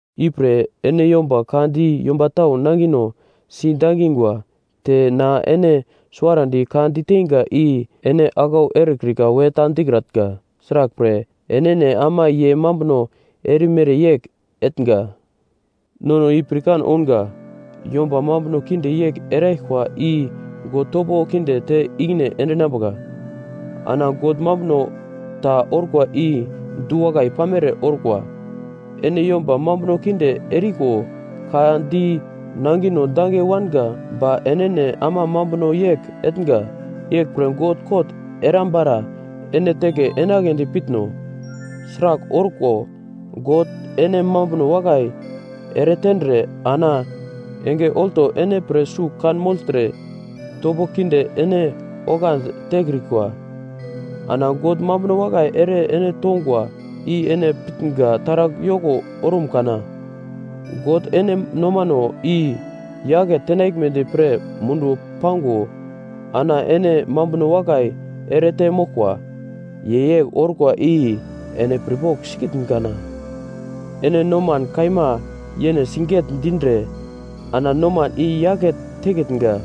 Ipre ene yomba ka di yomba tau nangino si dangingwa, te na ene suwarandi ka diteinga i ene aglau erekrika we ta dikratnga, sraglpre, enene ama ye mambuno erimere yegl etnga. Nono i pirkan ounga yomba mambuno kinde yegl eraglkwa i God topo kinde te ikine endinambuka, ana God mambuno ta orkwa i du-wakai pamere orkwa. Ene yomba mambuno kinde eriko ka di nangino dange wanga ba enene ama mambuno yegl etnga. Yeglpre God kot erambara ene teke enagledi pitno? Sragl orko, God ene mambuno wakai eretendre ana enge olto ene pre sugl kanmogltre topo kinde ene oglandi tekrikwa. Ana God mambuno wakai ere ene tongwa i ene pitnga taragl yoko orum kana? God ene nomano i yake tenaglmedi pre munduwo pango ana ene mambuno wakai erete moglkwa. Ye yegl orkwa i ene pirpogl sikitn kana? Ene noman kaima yene siget-dindre, ana noman i-yake tekitnga.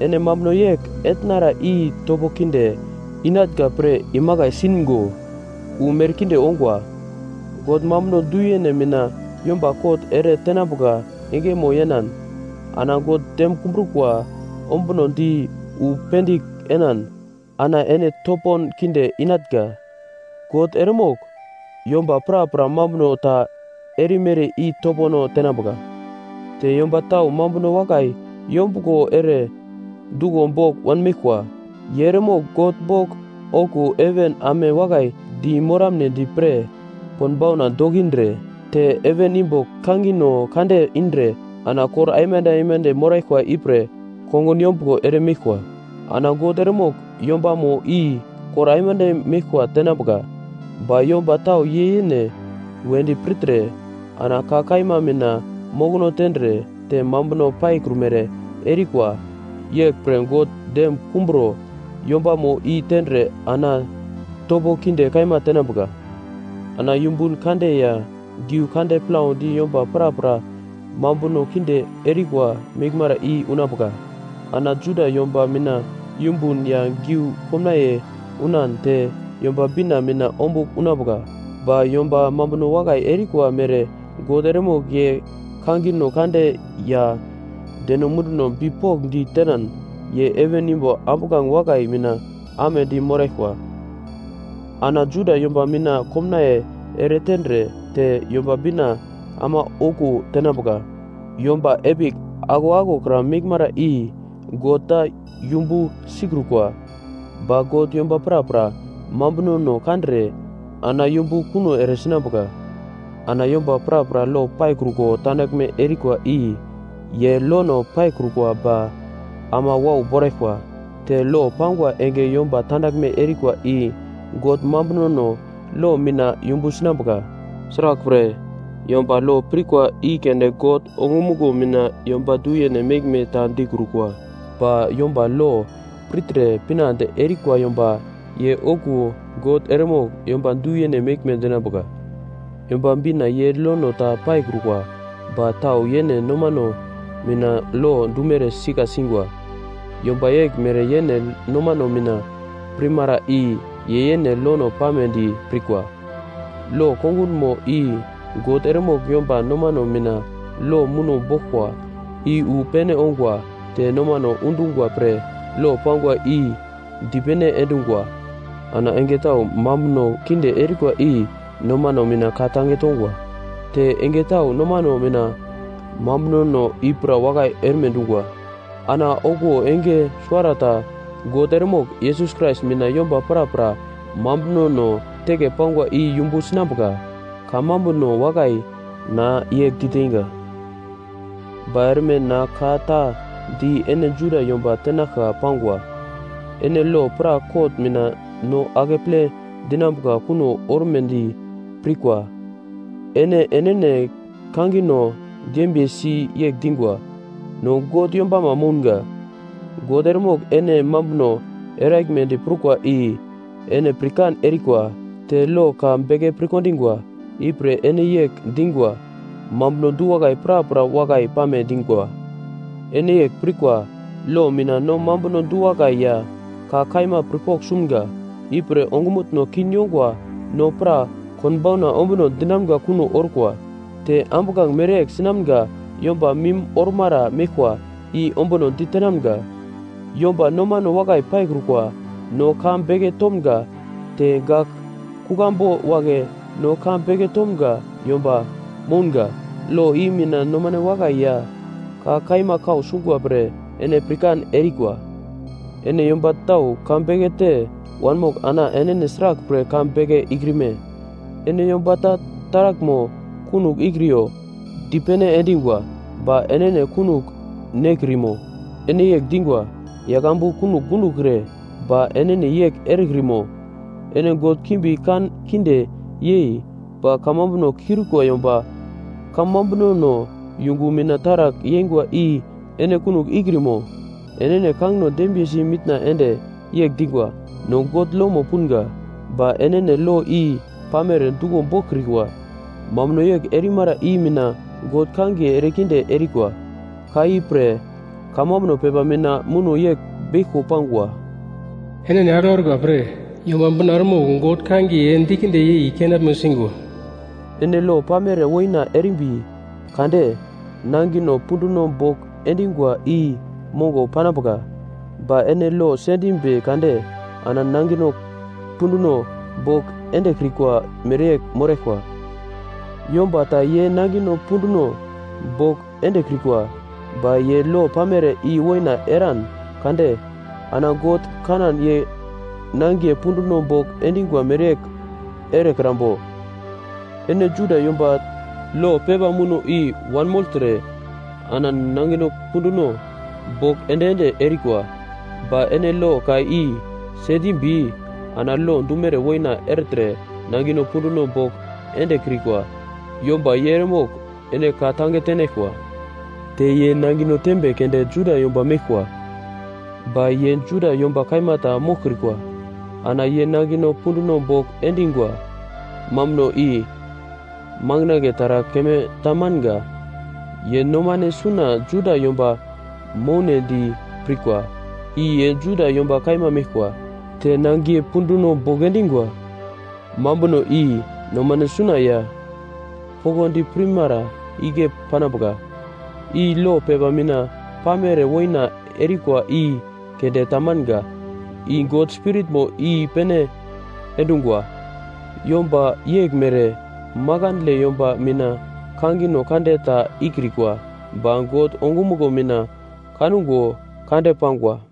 Ene mambuno yegl etnara i topo kinde inatnga pre imakai singo wu merkinde ongwa. God mambuno du-yene mina yomba kot ere tenambuka engemo yenan, ana God dem kumbrukwa ombunodi wu pendigl enan ana ene topon kinde inatnga. God eremogl “yomba prapra mambuno ta erimere i topono tenambuka.” Te yomba tau mambuno wakai yombuglo ere duglo bogl wanmeglkwa. Ye eremogl God bogl okuwo heven ame wakai di moramnedi pre konbauna dokindre te heven imbo kangino kande indre ana kor aimande aimande moraglkwa ipre kongun yombuglo ere meglkwa, ana God eremogl yombamo i kor aimande meglkwa tenambuka. Ba yomba tau ye yene wedi pirtre, ana ka kaima mina mokono tendre te mambuno paikrumere erikwa. Yeglpre God dem kumburo, yombamo i tendre ana topo kinde kaima tenambuka. Ana yumbun kande ya giu kande plaudi yomba prapra mambuno kinde erikwa meglmara i unambuka. Ana Juda yomba mina yumbun ya geu komnaiye unan te Yomba Bina mina ombugl unambuka. Ba yomba mambuno wakai erikwa mere God eremogl ye kangino kande ya deno munduno bipokndi tenan ye heven imbo ambuglange wakai mina amedi moraglkwa. Ana Juda yomba mina komnaiye ere tendre te Yomba Bina ama okuwo tenambuka. Yomba epigl aglo aglokra meglmere i God ta yumbu sikrukwa ba God yomba prapra mambunono kandre ana yumbu kuno ere sinambuka. Ana yomba prapra lo paikruko tandaglme erikwa i ye lono paikrukwa ba ama wau boraglkwa. Te lo pangwa enge yomba tandaglme erikwa i God mambunono lo mina yumbu sinambuka. Sraglpre, yomba lo pirkwa i keunde God ongumuglo mina yomba du-yene meglme ta dikrukwa. Ba yomba lo pirtre pinande erikwa yomba ye okuwo God eremogl yomba du-yene meglme dinambuka. Yomba Bina ye lono ta paikrukwa ba tau yene nomano mina lo dumere sika singwa. Yomba yeglmere yene nomano mina pirmara i ye yene lono pamedi pirkwa. Lo kongunmo i God eremogl yomba nomano mina lo muno boglkwa i wu pene ongwa te nomano undungwa pre lo pangwa i dipene endungwa. Ana enge tau mambuno kinde erikwa i nomano mina ka-tange tongwa, te enge tau nomano mina mambunono i pra wakai erme dungwa. Ana okuwo enge suwarata God eremogl Yesus Krais mina yomba prapra mambunono teke pangwa i yumbu sinambuka. Kamambuno wakai na yegl diteinga. Ba erme na ka ta di ene Juda yomba tenaglka pangwa. Ene lo pra kot mina no akeple dinambuka kuno ormedi pirkwa. Ene enene kangino dembiyesi yegl dingwa, “No God yombama mounga.” God eremogl ene mambuno eraglmedi prukwa i ene pirkan erikwa te lo ka beke pirkondingwa. Ipre ene yegl dingwa. Mambuno du-wakai prapra wakai pame dingwa. Ene yegl pirkwa, lo mina no mambuno du-wakai ya ka kaima pirpogl sumga. Ipre ongumutno kin yongwa no pra konbauna ombuno dinamga kuno orkwa. Te ambuglange mereyegl sinamga yomba mim ormara meglkwa i ombuno ditenamga. Yomba nomane wakai paikrukwa no ka beke tomga te gak kuglambu wagle no ka beke tomga yomba mounga. Lo i mina nomane wakai ya ka kaima kau sungwa pre ene pirkan erikwa. Ene yomba tau ka beke te wanmogl ana enene sraglpre ka beke ikrime? Ene yomba ta taraglmo kunogl ikriyo dipene endingwa ba enene kunogl nekrimo? Ene yegl dingwa, “Yagl ambu kunogl gundokre,” ba enene yegl erekrimo? Ene god kimbi kan kinde yei ba kamambuno kiurikwa yomba kamambunono yungu mina taragl yeingwa i ene kunogl ikrimo? Enene kangino dembiyesi mitna ende yegl dingwa, “No God lomo punga.” Ba enene lo i pamere duglo boglkrikwa. Mambuno yegl erimara i mina God kangiye erekinde erikwa. Ka i pre, kamambuno pepa mina muno yegl beglko pangwa, “Enene aglau erikwa pre, Yomba Bina eremogl God kangiye dikinde yei kenaglmo singwa.” Ene lo pamere woina erimbi kade nangino punduno bogl endingwa i mongo panambuka. Ba ene lo sendimbi kade ana nangino punduno bogl endekrikwa mereyegl moraglkwa. Yomba ta ye nangino punduno bogl endekrikwa, ba ye lo pamere i woina eran kade ana God kanan ye nangiye punduno bogl endingwa mereyegl erekrambo? Ene Juda yomba lo pepa muno i-wanmogltre ana nangino punduno bogl ende-ende erikwa. Ba ene lo ka i sendimbi ana lo dumere woina ertre nangino punduno bogl endekrikwa yomba ye eremogl ene ka-tange tenaglkwa. Te ye nangino tembe keunde Juda yomba meglkwa, ba ye Juda yomba kaima ta moglkrikwa. Ana ye nangino punduno bogl endingwa mambuno i manginagle taragl keme ta manga. Ye nomane suna Juda yomba mounedi pirkwa i ye Juda yomba kaima meglkwa. Te nangiye punduno bogl endingwa mambuno i nomane suna ya poglodi pirmara igle panambuka. I lo pepa mina pamere woina erikwa i keunde ta manga, i God Spiritmo i-pene endungwa. Yomba yeglmere makandle yomba mina kangino kande ta ikrikwa, ba God ongumuglo mina kango kande pangwa.